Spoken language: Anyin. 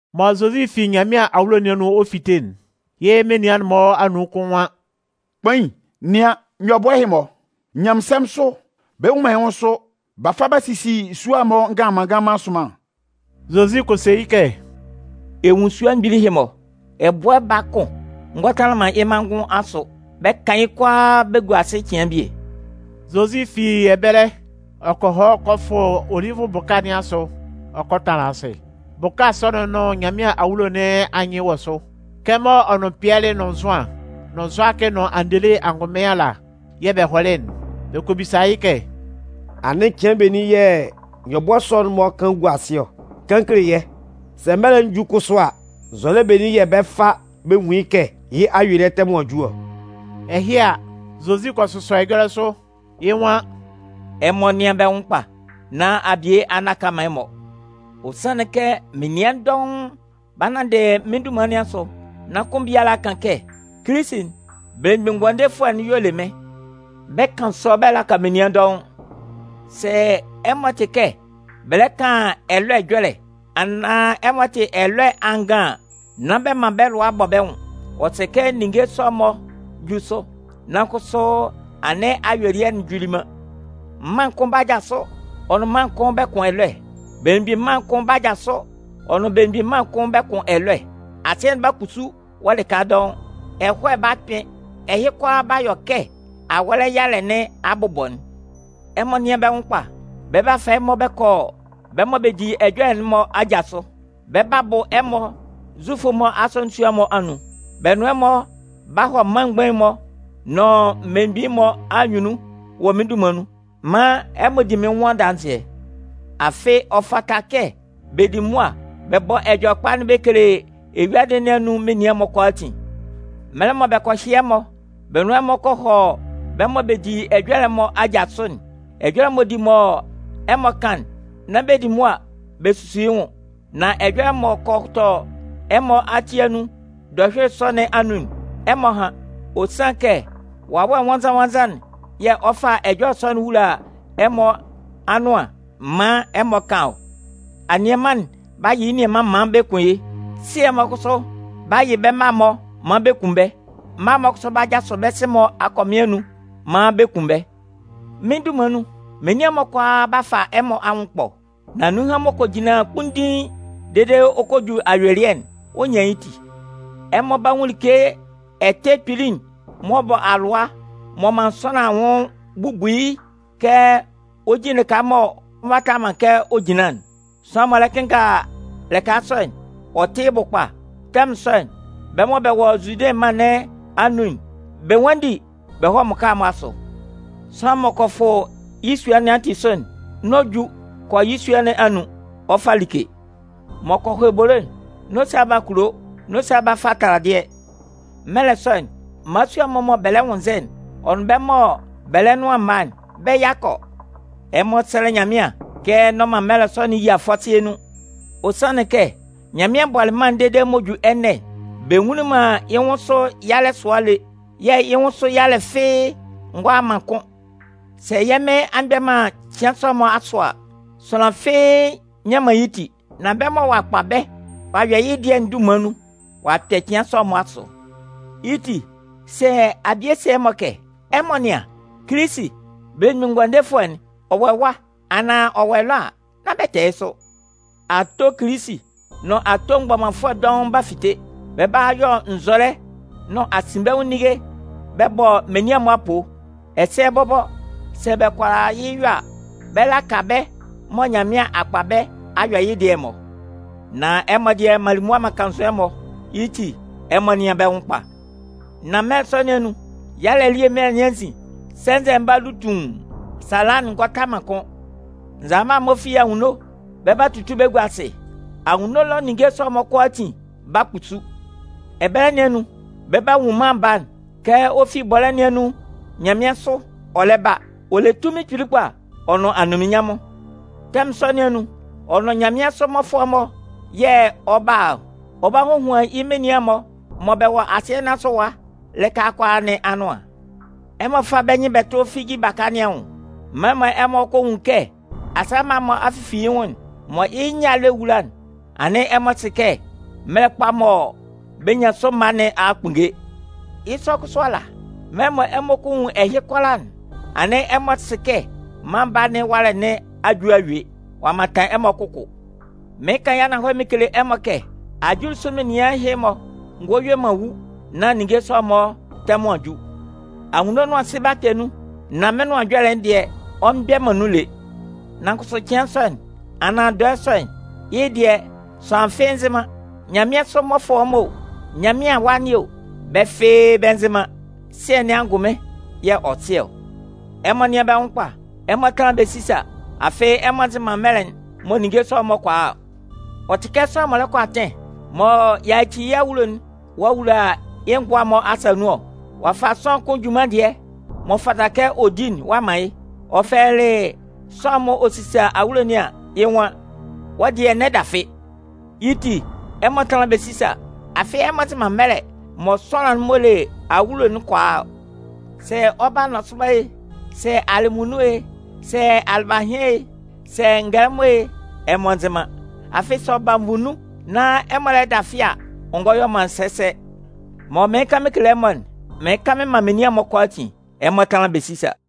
Mɔ Zozi fi Nyanmɩan awulo nɩn anun ɔ 'fite'n, yɩ́ menian'n-mɔ anun kʋn nwan: “Kpain, nɩan. Nyɔbʋɛ ɛhɩ-mɔ, nyanmɩnsɛmʋn, bɛ nnwun man yɩ́ nwʋn sʋ. B'a fa b'a sisi sua'n-mɔ nganlanman nganlanman sʋnman!” Zozi kɔ se yɩ́ kɛ: “Ɛ nwun sua mgbili ɛhɩ-mɔ ɔ? Ɛbʋɛ baa kʋn ngɔ tanlan man yɩ́ mangʋn asʋ. Bɛ 'kan yɩ́ kʋalaa bɛ gua asɩ cɩan bie.” Zozi fi ɛbɛlɛ ɔ kɔ hɔ kɔ fʋ Olivʋ bʋka nɩn asʋ ɔ kɔ tanlan asɩ. Bʋka sɔ'n nʋn Nyanmɩan awulo nɩn anyɩn wɔ sʋ. Kɛmɔ ɔ nʋn Pɩɛlɩ nʋn Zʋan, nʋn Zʋakɩ nʋn Andele angʋnmɩn ala yɛ̂ bɛ hɔlɩ'n, bɛ kɔ bisa yɩ́ kɛ: “Anɩn cɩan benin yɛ̂ nyɔbʋɛ sɔ'n-mɔ 'kan gua asɩ ɔ, kan kele yɛ́? Sɛ mɛlɛ'n ju kʋsʋ a, nzɔlɛ benin yɛ̂ bɛ 'fa bɛ nwun yɩ́ kɛ yɩ́ ayuelɩɛ tɛmʋn a ju ɔ?” Ɛhɩ a, Zozi kɔ sʋsɔ ɛjɔlɛ sʋ. Yɩ́ nwan: “Ɛmɔ nɩ́an bɛ́ nwʋn kpa nán abie a nnaka man ɛmɔ. Ɔ sanlɩn kɛ menian dɔʋn 'ba nanndɩ mɩ́n dunman nɩn asʋ nan kʋn biala kan kɛ: ‘Kilisi'n, Belemgbin Ngʋandefʋɛ'n y'ɔ le mɩ́n.’ Bɛ 'kan sɔ bɛ laka menian dɔʋn. Sɛ ɛmɔ tɩ kɛ bɛ lɛ kan ɛlɔɛ ɛjɔlɛ, anaan ɛmɔ tɩ ɛlɔɛ angan an, nán bɛ man bɛ́ lʋa bɔ bɛ́ nwʋn. Ɔ sɛ kɛ ninnge sɔ'n-mɔ jú sʋ, nan kʋsʋ anɩn ayuelɩɛ'n juli man. Mân kʋn 'ba jasʋ ɔ nʋn mân kʋn bɛ kʋn ɛlʋɛ. Belemgbin mân kʋn 'ba jasʋ ɔ nʋn belemgbin mân kʋn bɛ kʋn ɛlʋɛ. Asɩɛ'n 'ba kpusu wɔ lɩka dɔʋn. Ɛhɔɛ 'ba kpɩn. Ɛhɩ kʋalaa 'ba yɔ kɛ awɔlɛ yalɛ nɩn abʋbɔ'n. “Ɛmɔ nɩ́an bɛ́ nwʋn kpa. Bɛ 'ba fa ɛmɔ bɛ kɔ bɛ́ mɔ bɛ di ɛjɔlɛ'n-mɔ aja sʋ. Bɛ 'ba bʋ ɛmɔ Zufʋ'n-mɔ asɔnɩn sua'n-mɔ anun. Bɛ nʋn ɛmɔ 'ba hɔ mân mgbain'n-mɔ, nʋn mmelemgbin'n-mɔ anyunnun wɔ mɩ́n dunman nun maan ɛmɔ di mɩ́n nwʋn adanzɩɛ. Afɩ ɔ fata kɛ bɛ di mʋa bɛ bɔ Ɛjɔlɛkpa'n bɛ kele eyuadɩ nɩn anun menian'n-mɔ kʋalaatin. “Mɛlɛ mɔ bɛ kɔ hyɩ ɛmɔ, bɛ nʋn ɛmɔ kɔ hɔ bɛ́ mɔ bɛ di ɛjɔlɛ'n-mɔ aja sʋ'n, ɛjɔlɛ m'ɔ di mɔ ɛmɔ kan'n, nán bɛ di mʋa bɛ susu yɩ́ nwʋn. Nan ɛjɔlɛ m'ɔ kɔ tɔ ɛmɔ ati anun dɔhyʋɩlɩ sɔ nɩn anun'n, ɛmɔ hán. Ɔ sanlɩn kɛ Wawɛ Nwannzan-nwannzan'n yɛ̂ ɔ 'fa ɛjɔlɛ sɔ'n wula ɛmɔ anʋan maan ɛmɔ kan ɔ. Anianman'n 'ba yɩ yɩ́ nianman maan bɛ kun yɩ́. Sɩɛ'n-mɔ kʋsʋ 'ba yɩ bɛ́ mma'n-mɔ maan bɛ kun bɛ́. Mma'n-mɔ kʋsʋ 'ba jasʋ bɛ́ sɩ-mɔ akɔmɩn anun maan bɛ kun bɛ́. Mɩ́n dunman nun, menian'n-mɔ kʋalaa 'ba fa ɛmɔ anwʋn ɛkpɔ. Nan nunhan m'ɔ kɔ jinlan kpunndiin dede ɔ kɔ ju yɩ́ ayuelɩɛ'n, ɔ 'nyan yɩ́ ti. “Ɛmɔ 'ba nwun like ɛtɛ kpili'n m'ɔ bɔ alʋa m'ɔ man sʋanlan anwʋn bubu yɩ́'n kɛ ɔ jin lɩka m'ɔ nvata man kɛ ɔ jinlan'n. (Sʋanlan m'ɔ lɛ kɩnnga lɩka sɔ'n, ɔ tɩ́ yɩ́ bʋ kpa.) Tɛmʋn sɔ'n, bɛ́ mɔ bɛ wɔ Zude mân nɩn anun'n, bɛ nwánndi bɛ hɔ́ mmʋka'n-mɔ asʋ. Sʋanlan m'ɔ kɔ fʋ yɩ́ sua nɩn ati sʋ'n, n'ɔ ju kɔ yɩ́ sua nɩn anun, ɔ fa like. M'ɔ kɔ hɔ ebolo'n, n'ɔ sa ba kulo, n'ɔ sa ba fa taladɩɛ. Mɛlɛ sɔ'n, mmalasua'n-mɔ mɔ bɛ lɛ nwʋnnzɛ'n, ɔ nʋn bɛ́ mɔ bɛ lɛ nʋan mma'n, bɛ́ yakɔ! Ɛmɔ sɛ́lɛ Nyanmɩan kɛ n'ɔ man mɛlɛ sɔ'n yia fɔsɩɛ nun. Ɔ sanlɩn kɛ Nyanmɩan bɔlɩ mân'n dede m'ɔ ju ɛnɛ'n, bɛ nwunlin man yɩ́ nwʋn sʋ yalɛ sʋa lé. Yɛ̂ yɩ́ nwʋn sʋ yalɛ fɩ́ɩ́ ngɔ a man kʋ́n. Sɛ yɛ́ Mɩn a mgbɛ man cɩan sɔ'n-mɔ asʋ a, sʋanlan fɩ́ɩ́ nnyan man yɩ́ ti. Nan bɛ́ mɔ ɔ'a kpa bɛ́ ɔ'a yɔ yɩ́ dɩɛ'n dunman nun, ɔ'a kpɛ cɩan sɔ'n-mɔ asʋ. Yɩ́ ti, sɛ abie se ɛmɔ kɛ: ‘Ɛmɔ nɩ́an, Kilisi'n, Belemgbin Ngʋandefʋɛ'n, ɔ wɔ ɛwa anaan ɔ wɔ ɛlɔ’ a, nán bɛ tɛ yɩ́ sʋ. Ato Kilisi, nʋn ato mgbɔmanfʋɛ dɔʋn 'ba fite. Bɛ 'ba yɔ nzɔlɛ nʋn asinbɛnwʋn ninnge bɛ bɔ menian'n-mɔ apoo. Ɛsɛ bɔbɔ, sɛ bɛ kʋala yɩ́ yɔ a, bɛ 'laka bɛ mɔ Nyanmɩan a kpa bɛ́ a yɔ yɩ́ dɩɛ'n-mɔ. Nan ɛmɔ dɩɛ, m'an li mʋa m'an kannzʋ ɛmɔ! Yɩ́ ti, ɛmɔ nɩ́an bɛ́ nwʋn kpa. “Nan mɛlɛ sɔ nɩn anun, yalɛ elie mɛlɛ nɩn anzin, sɛnzɛ'n 'ba lu tuun, sala'n ngɔ ta man kʋ́n. Nzalama'n-mɔ fi anwunno bɛ 'ba tutu bɛ gua asɩ. Anwunno ɛlɔ ninnge sɔ'n-mɔ kʋalaatin 'ba kpusu. Ɛbɛlɛ nɩn anun, bɛ 'ba nwun Mân Baa'n, kɛ ɔ fi bɔlɛ́ nɩn anun nyanmɩansʋ ɔ lɛ ba. Ɔ le tunmin kpili kpa ɔ nʋn anunminnyanmʋn. Tɛmʋn sɔ nɩn anun, ɔ nʋn yɩ́ nyanmɩansʋ mmɔfʋɛ'n-mɔ yɛ̂ ɔ 'ba a ɔ. Ɔ 'ba hohuan yɩ́ menian'n-mɔ mɔ bɛ wɔ asɩɛ nɩn asʋ ɛwa lɩka kʋalaa nɩn anʋan. “Ɛmɔ fá bɛ́ nyɩn bɛ tʋ́ figi baka nɩn anwʋn. Mɛlɛ mɔ ɛmɔ kɔ nwun kɛ asaa mma a fifi yɩ́ nwʋn'n, mɔ yɩ nyâ'n lɛ wula'n, anɩn ɛmɔ sɩ kɛ mɛlɛ kpa'n mɔ bɛ nyan sʋ mma nɩn a kpunnge. Yɩ́ sʋ kʋsʋ ala, mɛlɛ mɔ ɛmɔ kɔ nwun ɛhɩ kʋalaa'n, anɩn ɛmɔ sɩ kɛ Mân Baa nɩn ɛwalɛ nɩn a ju a yue, ɔ'a mantan ɛmɔ kʋkʋ. Mɩɩn kan yɩ́ ananhɔlɛ mɩn kele ɛmɔ kɛ ajulisʋ menian ɛhɩ-mɔ ngɔ yue man wu nán ninnge sɔ'n-mɔ tɛmʋn a ju. Anwunno nʋn asɩ 'ba kpɛ nun, nan mɩ́n Nʋan Ɛjɔlɛ'n dɩɛ, ɔ mgbɛ man nun lé. “Nan kʋsʋ cɩan sɔ'n, anaan dɔɛ sɔ'n, yɩ́ dɩɛ, sʋanlan fɩ́ɩ́ nzɩ man. Nyanmɩansʋ mmɔfʋɛ'n-mɔ o, Nyanmɩan Awa nɩn o, bɛ́ fɩ́ɩ́ bɛ nzɩ man. Sɩɛ nɩn angʋnmɩn yɛ̂ ɔ sɩ ɔ. Ɛmɔ nɩ́an bɛ́ nwʋn kpa, ɛmɔ tánlan bɛ sísa. Afɩ ɛmɔ nzɩ man mɛlɛ mɔ ninnge sɔ'n-mɔ kɔ a ɔ. Ɔ tɩ kɛ sʋanlan m'ɔ lɛ kɔ atɩn, mɔ ɔ'a yaci yɩ́ awulo'n ɔ'a wula yɩ́ ngʋa'n-mɔ asa nun ɔ. Ɔ'a fa sʋanlan kʋn junman dɩɛ m'ɔ fata kɛ ɔ di'n ɔ'a man yɩ́. Ɔ fɛlɛlɩ sʋanlan'n m'ɔ sisa awulo nɩn an, yɩ́ nwan: ‘Wɔ́ dɩɛ, n'ɛ dafɩ.’ Yɩ́ ti, ɛmɔ tánlan bɛ sísa. Afɩ ɛmɔ nzɩ man mɛlɛ mɔ sʋanlan'n m'ɔ le awulo'n kɔ a ɔ. Sɛ ɔ 'ba nɔsʋba e, sɛ alɩmunnun e, sɛ alɩbahɩan e, sɛ ngɛlɛmɔ e, ɛmɔ nzɩ man. Afɩ, sɛ ɔ ba nvu nun, nán ɛmɔ lɛ dafɩ a, ɔ ngɔ yɔ man sɛsɛ. Mɔ mɩɩn kan mɩn kele ɛmɔ'n, mɩɩn kan mɩn man menian'n-mɔ kʋalaatin: Ɛmɔ tánlan bɛ sísa.”